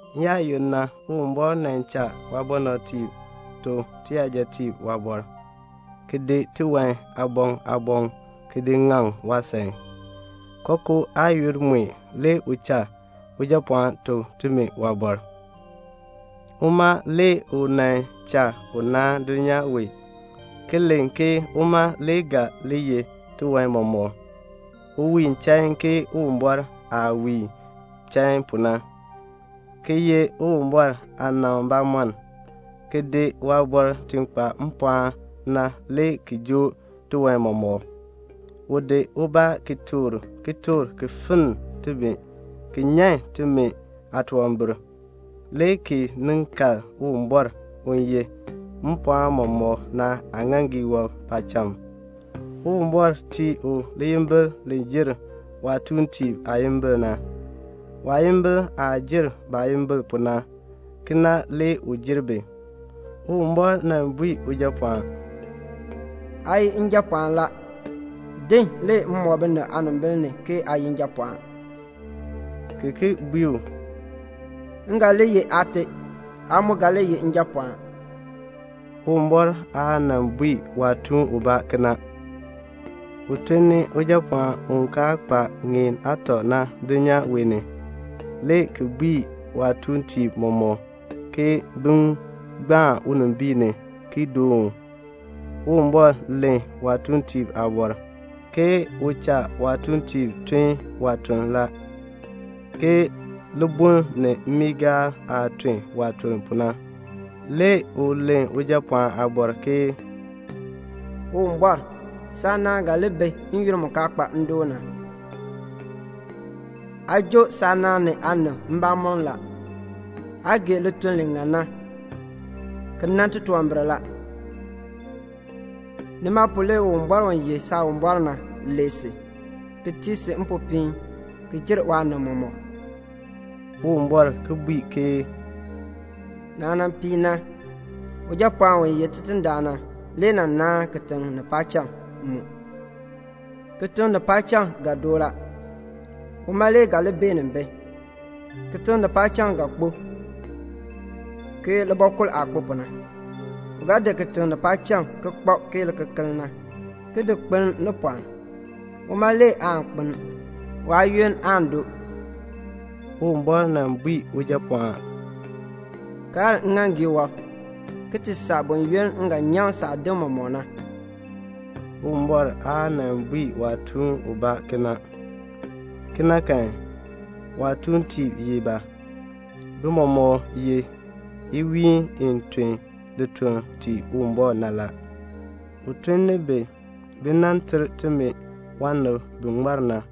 N-yaayoonn na Uwumbɔr nan cha waabɔnabtiib tuk tiyajatiib waaliin, ki di tiwan aaboŋ aaboŋ ki di ŋaŋ waasan. Kookoo aayoonn mue le u cha Ujapɔɔn tuk timi waaliin. Uma le u nan cha u naan dulnyaa wee, ki len ke uma le ga li yeh tiwan mɔmɔk. U wiin chain ke Uwumbɔr aah wiin chain pu na, ki ye Uwumbɔr aanaŋ bamɔnn, ki di waaliin i kpa mpɔɔn na le ki joo tiwan mɔmɔk. U di ubaa ki toor kitork ki finn timi ki nyan timi aatunwambir, le ki nin kal Uwumbɔr u yeh mpɔɔn mɔmɔk na aaŋaaŋgii wɔb paacham. Uwumbɔr tii u liyimbil li jer waatuuntiib aayimbil na. Waayimbil aah jer baayimbil pu na, kena le u jer bi. Uwumbɔr nan bui Ujapɔɔn, "Aa ye Njapɔɔn la. Din, le m mɔk binib aanimbil ni ke aa ye Njapɔɔn;" ki ki bui u, "M ga li ye Aate, aa mu ga li ye Njapɔɔn." Uwumbɔr aa nan bui waatuun ubaa kena. U tun ni Ujapɔɔn u kaa kpa ŋeen aatɔ na dulnyaa wee ni, le ki bui waatuuntiib mɔmɔk ke bin gbaan unimbiin ni ki doon u. Uwumbɔr len waatuuntiib aabɔr, ke u cha waatuuntiib tun waatuln la, ke libuln ni mmiigaal aah tun waatuln pu na. Le u len Ujapɔɔn aabɔr ke "Uwumbɔr, saanaan ga li bi n-yoonn mu kaa kpa ndoon na. Aa joo saanaan ni aanib mbamɔm la. Aa gee lituln li ŋan na, ki nan titunwambir la. Nima na le Uwumbɔr u ye Saawumbɔr na, lee si, ki tii si mpopiin ki jer waanib mɔmɔk." Uwumbɔr ki bui ke "Naah nan piin na, Ujapɔɔn u ye Tidindaan na, u nan naan kitiŋ, ni paacham mu. Kitiŋ ni paacham ga doo la, uma le ga li beenin bi. Kitiŋ ni paacham ga kpo ke libɔkul aah kpo pu na. U ga di kitiŋ ni paacham ki kpab ke likekeln na, ki di kpeln ni pɔɔn. Uma le aan kpeln; waayoonn aan doo." Uwumbɔr nan bui Ujapɔɔn, "Kaln ŋŋaaŋgii wɔb, ki ti saa buyoonn m ga nyaŋ saadim mɔmɔk na." Uwumbɔr aa nan bui waatuun ubaa kena. Kena kan, waatuuntiib ye ba? Bi mɔmɔk ye iwiin i tun lituln tii Uwumbɔr na. U tun ni bi, bi nan ter timi waanib bi ŋmar na.